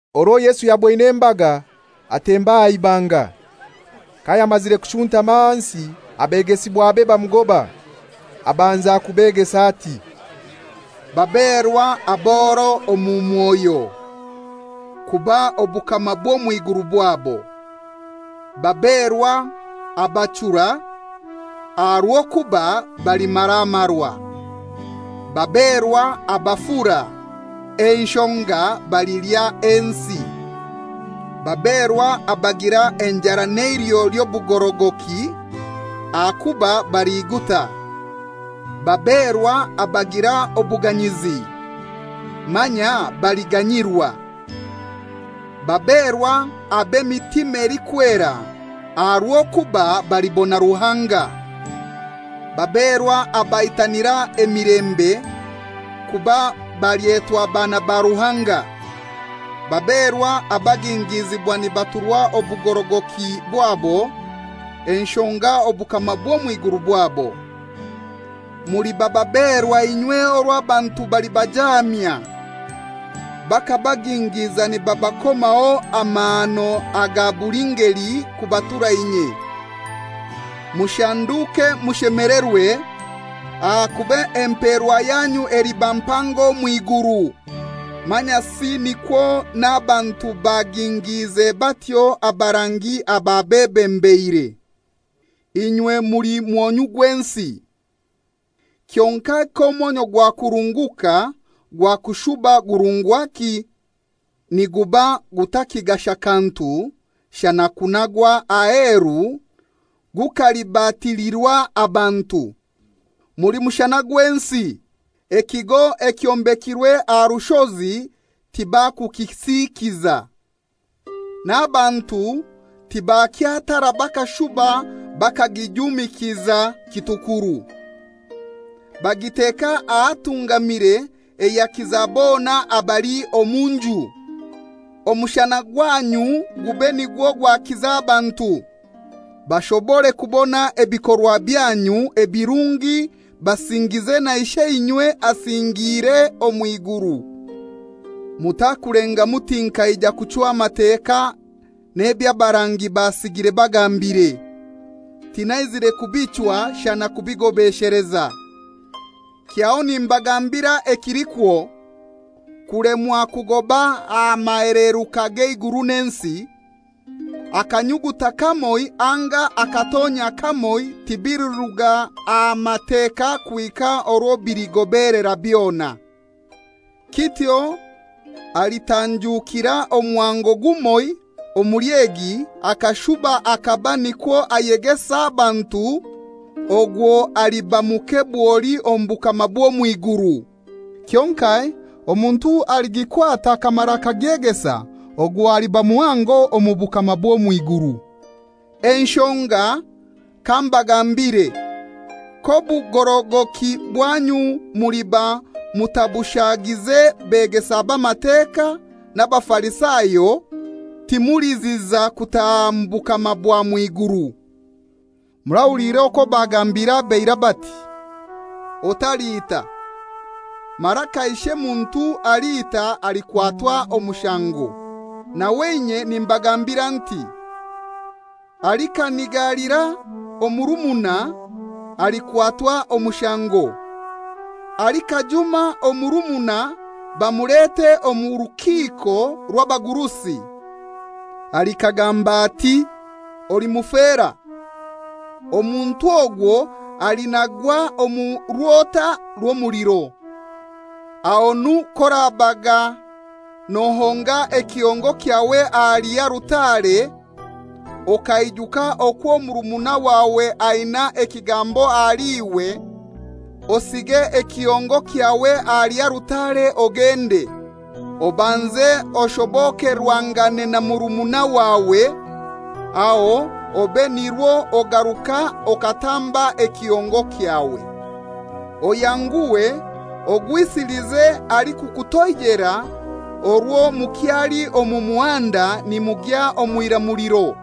Orwo Yesu yaboine embaga, atemba aha ibanga. Kayamazire kushuntama ahansi, abegesibwabe bamugoba. Abanza kubegesa ati, «Baberwa aboro omu mwoyo, kuba obukama bw'omw'iguru bwabo. Baberwa abachura, aha rw'okuba balimaramarwa. Baberwa abafura, enshonga balilya ensi. Baberwa abagira enjara n'eiliho ly'obugorogoki, ahakuba baliguta. Baberwa abagira obuganyizi, manya baliganyirwa. Baberwa ab'emitima elikwera, aha rw'okuba balibona Ruhanga. Baberwa abaitanira emilembe, kuba balyetwa baana ba Ruhanga. Baberwa abagingiizibwa nibaturwa obugorogoki bwabo, enshonga obukama bw'omw'iguru bwabo. Muliba baberwa inywe orwo abantu balibajaamya, bakabagingiiza nibabakomaho amahano aga buli ngeli kubatura inye. Mushanduke mushemelerwe, ahakuba emperwa yanyu eliba mpango omw'iguru. Manyasi nikwo n'abantu bagingiize batyo abarangi ababebembeire.» «Inywe muli mwonyu gw'ensi. Kyonkai k'omwonyu gwakurunguka gwakushuba gurungwaki? Niguba gutakigasha kantu shana okunagwa aheru gukalibatilirwa abantu. Muli mushana gw'ensi. Ekigo ekyombekirwe aha rushozi tibakukisikiza. N'abantu tibakya tara bakashuba bakagijumikiza kitukuru. Bagiteka ahatungamire eyakiza bona abali omu nju. Omushana gwanyu gube nikwo gwakiza abantu, bashobore kubona ebikorwa byanyu ebirungi basingize na Isheinywe asingiire omw'iguru.» «Mutakulenga muti nkaija kuchwa Mateka n'eby'abarangi basigire bagambire. Tinaizire kubichwa shana kubigobesheleza. Kyaho nimbagambira ekilikwo, kulemwa kugoba aha maheleruka g'eiguru n'ensi, akanyuguta kamoi anga akatonyia kamoi tibiliruga aha Mateka kuhika orwo biligobelera byona. Kityo alitanjukira omuhango gumoiho omuli egi akashuba akaba nikwo ayegesa abantu, ogwo aliba muke bwoli omu bukama bw'omw'iguru. Kyonkai omuntu aligikwata akamara akagegesa ogwo aliba muhango omu bukama bw'omw'iguru. Enshonga kambagambire, k'obugorogoki bwanyu muliba mutabushagize begesa b'Amateka na Bafarisayo, timuliziza kutaha mu bukama bwa mw'iguru.» «Murahuliire okwo bagambiire ab'eirai bati, ‹Otaliita; mara kaishe muntu aliita alikwatwa omushango?› Nawe inye nimbagambira nti; alikanigalira omurumuna alikwatwa omushango. Alikajuma omurumuna bamulete omu rukiiko rw'abagurusi. Alikagamba ati, ‹Oli mufera!› Omuntu ogwo alinagwa omu rwota rw'omuliro. Ahonu k'orabaga nohonga ekihongo kyawe ahali alutare, okaijuka okwo murumuna wawe aina ekigambo ahali iwe, osige ekihongo kyawe ahali alutare ogende. Obanze oshobokerwangane na murumuna wawe, aho obe nirwo ogaruka okatamba ekihongo kyawe. Oyanguhe ogwisilize alikukutoijera orwo mukyali omu muhanda nimugya omw'iramuliro,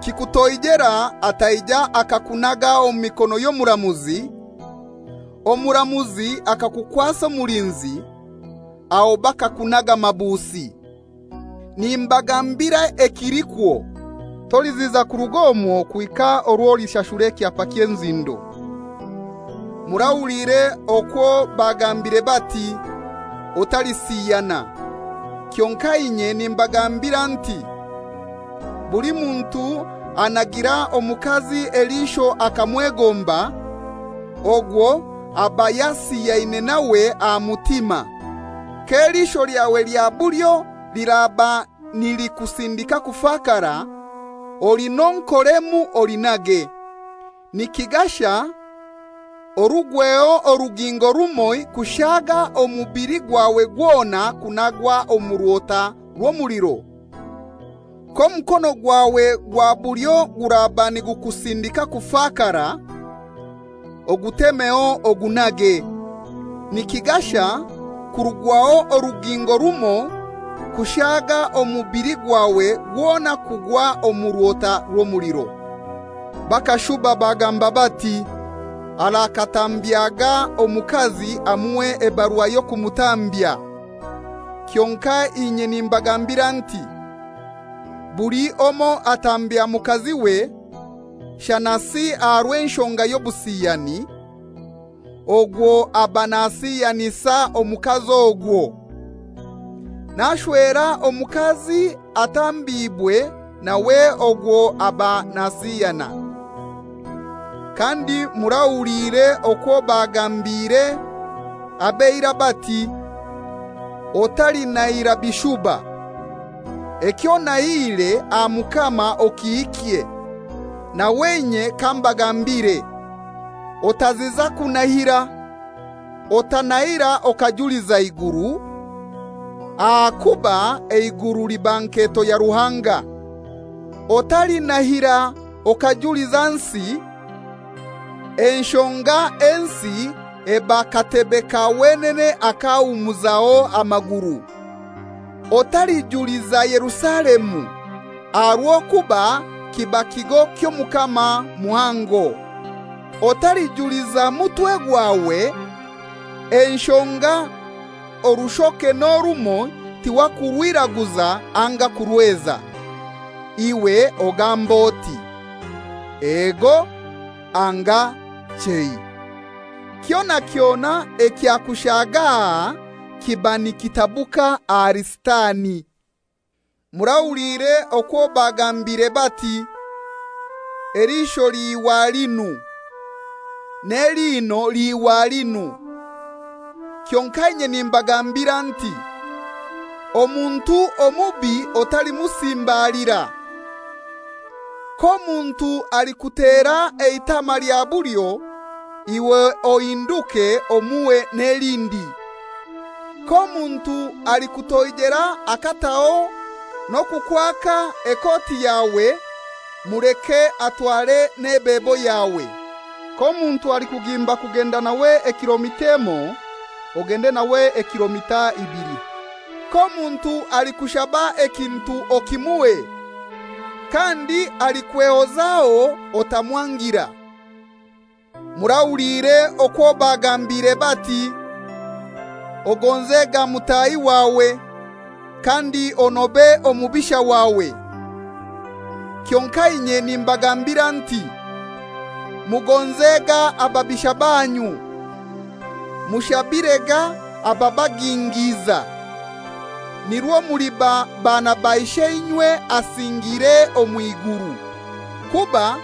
kikutoijera ataija akakunaga omu mikono y'omuramuzi, omuramuzi akakukwasa omulinzi, aho bakakunaga mabusi. Nimbagambira ekilikwo, toliziza kurug'omwo kuhika orwo olishashura ekyapa ky'enzindo.» «Murahuliire okwo bagambire bati, ‹Otalisiyana.› Kyonkai inye nimbagambira nti: Buli muntu anagira omukazi eliisho akamwegomba, ogwo aba yasiyaine nawe aha mutima. K'eliisho lyawe lya bulyo liraba nilikusindika kufakara, olinonkoremu olinage. Nikigasha orugweho orugingo rumoi kushaga omubili gwawe gwona kunagwa omu rwota rw'omuliro. K'omukono gwawe gwa bulyo guraba nigukusindika kufakara, ogutemeho ogunage. Nikigasha kurugwaho orugingo rumoi kushaga omubili gwawe gwona kugwa omu rwota rw'omuliro.» «Bakashuba bagamba bati, ‹Arakatambyaga omukazi amuhe ebarua y'okumutambya.› Kyonkai inye nimbagambira nti: Buli omoi atambya mukaziwe, shanasi aha rw'enshonga y'obusiyani, ogwo aba nasiyanisa omukazi ogwo. N'ashwera omukazi atambiibwe nawe ogwo aba nasiyana.» «Kandi murahuliire okwo bagambiire ab'eirai bati, ‹Otalinahira bishuba, eky'onahiire aha Mukama okihikye.› Nawe inye kambagambire: Otaziza kunahira. Otanahira okajuliza iguru, ahakuba eiguru liba nketo ya Ruhanga. Otalinahira okajuliza nsi, enshonga ensi eba katebe ka wenene ak'ahumuzaho amaguru. Otalijuliza Yerusalemu, aha rw'okuba kiba kigo ky'Omukama muhango. Otalijuliza mutwe gwawe, enshonga orushoke n'orumoi tiwakurwiraguza anga kurweza. Iwe ogambe oti, ‹Ego› anga ‹Chei.› Kyona kyona ekyakushaga aha kiba nikitabuka ahali Sitani.» «Murahuliire okwo bagambire bati, ‹Eliisho liihwa linu, n'eliino liihwa linu.› Kyonkai inye nimbagambira nti: Omuntu omubi otalimusimbalira. K'omuntu alikutera eitama lya bulyo, iwe ohinduke omuhe n'elindi. K'omuntu alikutoijera akataho n'okukwaka ekoti yawe, muleke atware n'ebebo yawe. K'omuntu alikugimba kugenda nawe ekilomita emoi, ogende nawe ekilomita ibili. K'omuntu alikushaba ekintu okimuhe, kandi alikwehozaho otamwangira.» «Murahuliire okwo bagambire bati, ‹Ogonzega mutahi wawe, kandi onobe omubisha wawe.› Kyonkai inye nimbagambira nti: Mugonzega ababisha banyu, mushabirega ababagingiiza, nirwo muliba baana ba Isheinywe asingiire omw'iguru. Kuba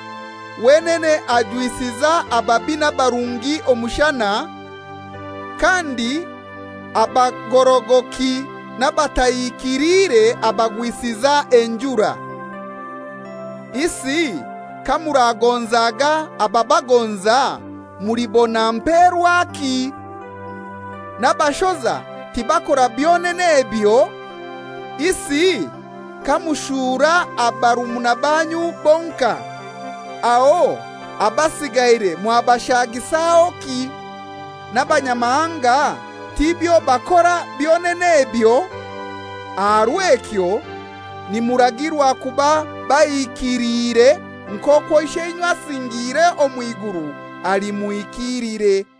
wenene ajwisiza ababi n'abarungi omushana, kandi abagorogoki n'abatahikiliire abagwisiza enjura. Isi kamuragonzaga abababagonza mulibona mperwaki? N'abashoza tibakora byonene ebyo? Isi kamurashuura barumuna banyu bonkai, aho abasigaire mwabashagisahoki? N'abanyamahanga tibyo bakora byonene ebyo? Aha rw'ekyo nimuragirwa kuba bahikilire nk'okwo Isheinywe asingiire omw'iguru ali muhikiilire.»